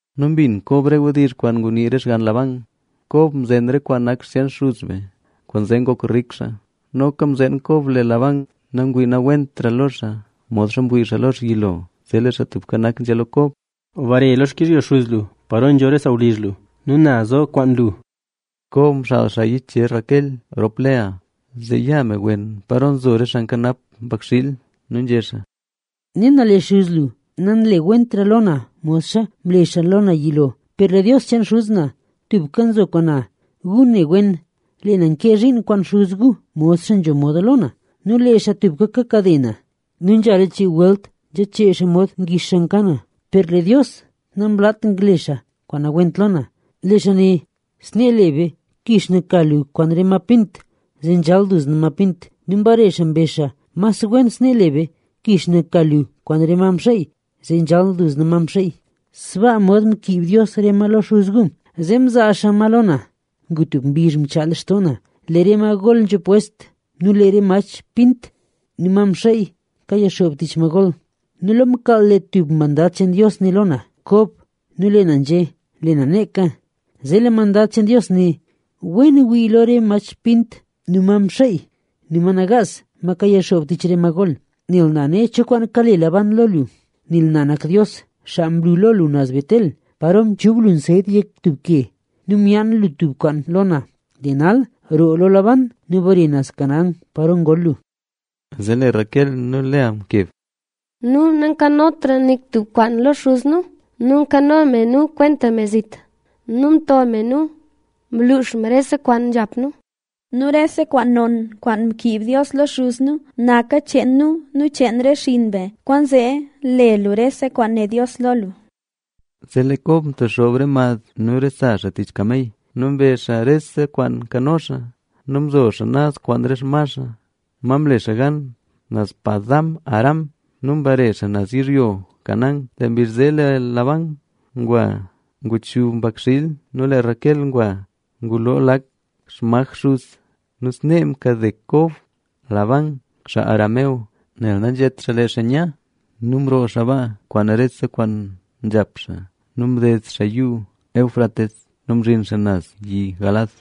Nu mbin Kob re wdizh kwaan ngunii re xgann Labán: “Kob mzen re kwaan nak xcheen xuz be, kwaanzee ngok rik xaa”. Noka mzeen Kob lee Labán ngwii nawentra lo xaa modxa mwii xaa lo xaa yilo. Zee lee Xaa Tubka Nak nzhé lo Kob: —Bare lo xkizhyo xuz lu paro nzho re sawlizh lu nu na zo kwaan lu. Kob mxaal xaa yichezh Raquel rop Lea zee ya me wen paro nzo xaa nkanap xaa mbakxiil. Nu nzhé xaa: —Ne na lee xuz lu nanlewentra lo na modxa mle xaa lo na yilo. Per lee Dios cheen xuz na tubka nzo kwaan na. Gu ne wen, lee na nkee zhiin kwaan xuz gu modxa nzho moda lo na. Nu lee xaa tubka kakade na nu nzhala chii welt nzhachee xaa mod ngix xaa nka na. Per lee Dios namlaat ngle xaa kwaan nawent lo na. Lee xaa né: “Snee le be. Kix na ka lu kwaan re ma pint, zee nzhal duzna ma pint.” Nu mbare xaa mbezh xaa: “Mas wen snee le be. Kix na ka lu kwaan re ma mxeey, zee nzhal duzna ma mxeey.” Sbaa mod mkiib Dios re ma lo xuz gu, zee mzaa xaa ma lo na. Ngu tub mbizh mchaa lextoo na, lee re ma gol nzho pwest nu lee re mach pint nu ma mxeey kayixoob tich ma gol. Nu lo mkaal lee tub mandad cheen Dios né lo na: “Kob”. Nu lee na nzhé: “Lee na neeka”. Zee lee mandad cheen Dios né: “Wen wii lo re mach pint nu ma mxeey nu ma nagaas, ma kayixoob tich re ma gol. Nel na ne cho kwaan kale Labán lo lu. Nel na nak Dios, xaa mlu lo lu naz Betel, paro mchub lu nsyet yek tub ke nu myaan lu tub kwaan lo na. Lee nal, roo lo Labán nu bare naz Canaán paro ngol lu.” Zee lee Raquel nu Lea mkeb: —Nu, nu nkano me nu kwenta me zit nu mto me nu, mluux me rese kwaan nzhap nu. Nu rese kwaan non, kwaan mkiib Dios lo xuz nu, naka cheen nu nu cheen re xinn be. Kwaanzee le lu rese kwaan né Dios lo lu. Zee lee Kob mtexoob re mad nu re sa xaa tich kamey nu mbe xaa rese kwaan nkano xaa. Nu mzo xaa naz kwaan re xma xaa, ma mle xaa gan naz Padan-aram nu mbare xaa naz yizhyo Canaán. Lee mbizh zee lee Labán ngwa nguchub mbakxiil nu lee Raquel ngwa nguloo lak xmaj xuz. Nu snee mkade Kob Labán, xaa Aram, nel nanzhét xaa lee xaa nya. Nu mroo xaa baa kwaan rese kwaan nzhap xaa nu mded xaa Yuu Éufrates nu mzhin xaa naz yi Galaad.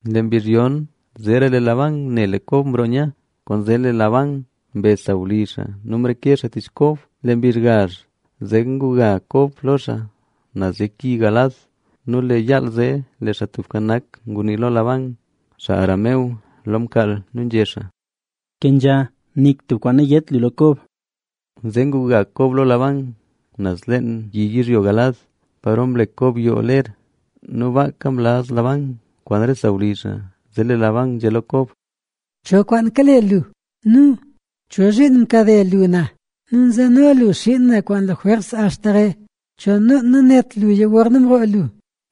Lee mbizh yon, zeera lee Labán ne lee Kob mroo nya, kwaanzee lee Labán mbe sawlizh xaa nu mreke xaa tich Kob. Lee mbizh gazh zee nguga Kob lo xaa naz yek yi Galaad. Nu lee yaal zee lee Xaa Tubka Nak ngunii lo Labán, xaa Aram, lo mkaal nu nzhé xaa: —Kenzha. Nik tub kwaan nayét lu lo Kob. Zee nguga Kob lo Labán naz leen Yi Galaad, paro mlek Kob yoo ler. Nu baaka mlaz Labán kwaan re sawlizh xaa. Zee lee Labán nzhé lo Kob: —¿Cho kwaan kale lu? Nu ¿cho zhiin mkade lu na nu nzeno lu xiin na kwaan lajwers axta re? ¿Cho noon nanét luya gorna mroo lu?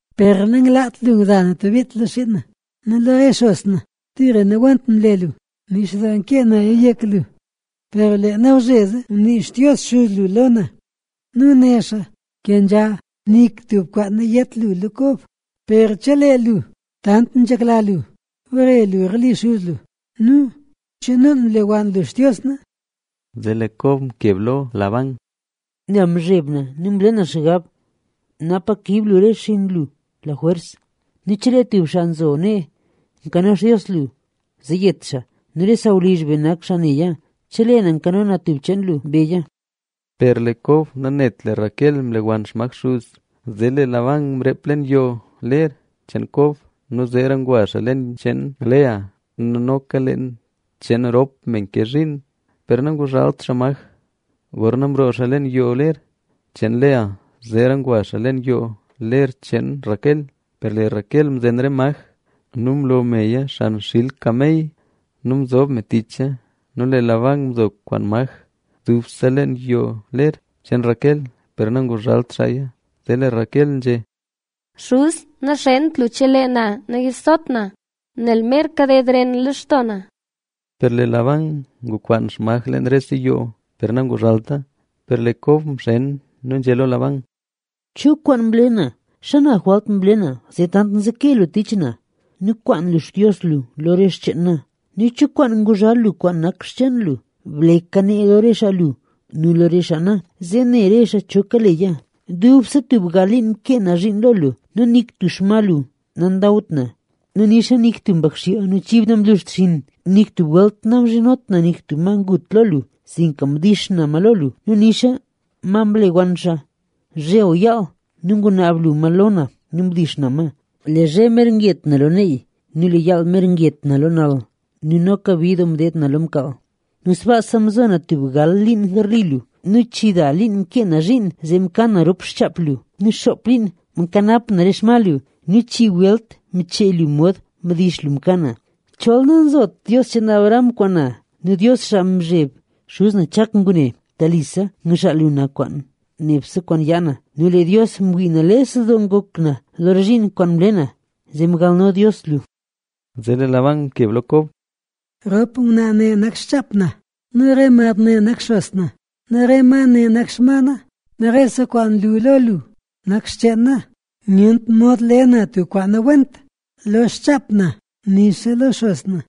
Per nanglaat lu ngza na tub bit lo xiin na nu lo re xos na. ¡Tira nawent mle lu! Nix doo kee naya yek lu, per lee nawzhezee ngunii Xtios xuz lu lo na nu né xaa: “Kenzha. Nik tub kwaan nayét lu lo Kob.” Per chelee lu tant nzhekla lu bare lu garli xuz lu, ¿cho noon mle wann lu xtios na? Zee lee Kob mkeb lo Labán: —Nel mzheb na nu mle na xgab napa kiib lu re xinn lu lajwers lo na. Nu chelee tub xaa nzo nee nkano xtios lu, ¡zee yet xaa! Nu re sawlizh be nak xaa neya. Chelee na nkano na tub xcheen lu, beya. Per lee Kob nanet lee Raquel mlewann xmaj xuz. Zee lee Labán mreep leen yoo ler cheen Kob, zeera ngwa xaa leen cheen Lea nu noka leen cheen rop me nke zhiin, per nanguzhalt xaa maj. Gorna mroo xaa leen yo ler cheen Lea, zeera ngwa xaa leen yoo ler cheen Raquel. Per lee Raquel mzen re maj nu mlo meya xan xil kamey nu mzob me ticha. Nu lee Labán nzo nkwaan maj dubse leen yoo ler cheen Raquel, per nanguzhalt xaaya. Zee lee Raquel nzhé: —Xuz na, naxent lu chelee na nayizot na, nel mer kaded ren lextoo na. Per lee Labán ngukwaan xmaj leen rese yoo, per nanguzhalta. Per lee Kob nayii nu nzhé lo Labán: —¿Cho kwaan mle na? ¿Xana jwalt mle na zee tant nzeke lu tich na? Nu mkwaan lu xtios lu lo re xcheen na, ¿nu cho kwaan nguzhal lu kwaan nak xcheen lu? ¡Bleka nee lo re xaa lu nu lo re xaa na, zee ne re xaa cho kaleya! Dubse tub gal liin mkee na zhiin lo lu nu nik tub xma lu nandawt na nu nixa nik tub xpakxiil lu nu xchib lu namluxt xinn. Nik tub welt namzhinot na tub ma ngut lo lu, sinka mdix na ma lo lu. Nu nixa ma mlewann xaa, zhe o yaal nu ngunaab lu ma lo na nu mdix na ma. Lee zhe mer nget na lo neey nu lee yaal mer nget na lo nal nu noka bid doo mdeed na lo mkaal. Nu sbaa mzo na tub gal liin garli lu, chida liin mkee na zhiin zee mka na rop xchaap lu nu xoop liin mkanap na re xma lu. Nu chii welt mchee lu mod mdix lu mka na. Chol nangzot Dios cheen Abraham kwaan na nu Dios xaa mzheb xuz na Chak ngune, telise ngxaal lu na kwaan nebse kwaan yaa na. Nu lee Dios mwii nales doo ngok na lo re zhiin kwaan mle na, zee mgalno Dios lu. Zee lee Labán mkeb lo Kob: —Rop ngwnaa ne nak xchaap na nu re mad ne nak xos na nu re ma ne nak xma na; nu rese kwaan nlu lo lu nak xcheen na. Nyent mod le na tub kwaan nawent lo xchaap na nixa lo xos na.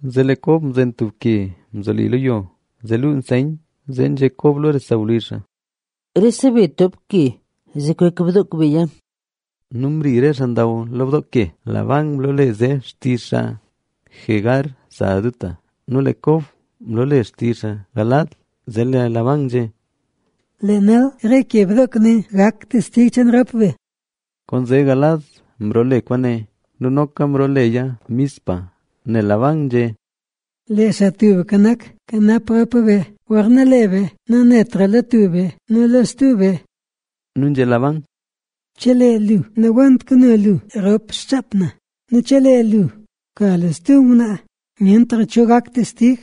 Zee lee Kob mzen tub ke mzoli lo yo, zee luu nseyn. Zee nzhé Kob lo re sawlizh xaa: —Rese be toop ke zee kwek bdook beya. Nu mri re xaa ndaw lo bdook ke. Labán mloole zee xtizh xaa “Jegar Sahaduta” nu lee Kob mloole zee xtizh xaa “Galaad”.a Zee lee Labán nzhé: —Lee nal re ke bdook ne gak testig cheen rop be. Kwaanzee Galaad mloole kwaane. Nu noka mrooleya Mizpa,b nel Labán nzhé: “Lee Xaa Tubka Nak kanap rop be gorna lee be nanetra lo tub be nu lo stub be”. Nu nzhé Labán: —Chelee lu nawent kano lu rop xchaap na nu chelee lu ka lu stub ngwnaa, nyentra cho gak testig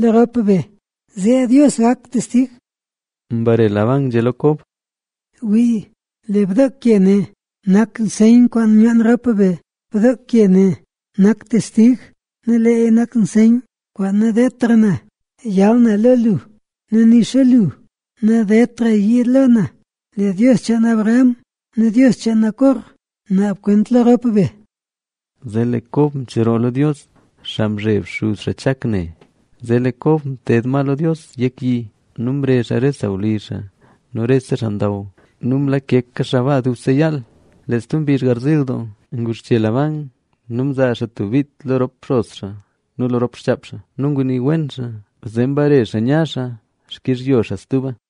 lo rop be, zee Dios gak testig. Mbare Labán nzhé lo Kob: —Wii, lee bdook ke ne nak nseyn kwaan myaan rop be. Bdook ke ne nak testig nu leeya nak nseyn kwaan nadeedtra na yal na lo lu nu nixa lu nadedtra yiid lo na. Lee Dios cheen Abraham nu Dios cheen Nacor naab kwent lo rop be. Zee lee Kob mcheroo lo Dios, xaa mzheb xuz xaa Chak ne. Zee lee Kob mted ma lo Dios yek yi nu mrezh xaa re sawlizh xaa nu rese xaa ndaw nu mlakeka xaa baa dubse yaal. Lee stub mbizh garziil doo, nguxche Labán nu mzaa xaa tub bit lo re xos xaa nu lo rop xchaap xaa nu ngunii wen xaa. Zee mbare xaa nya xaa xkizhyo xaa stuba.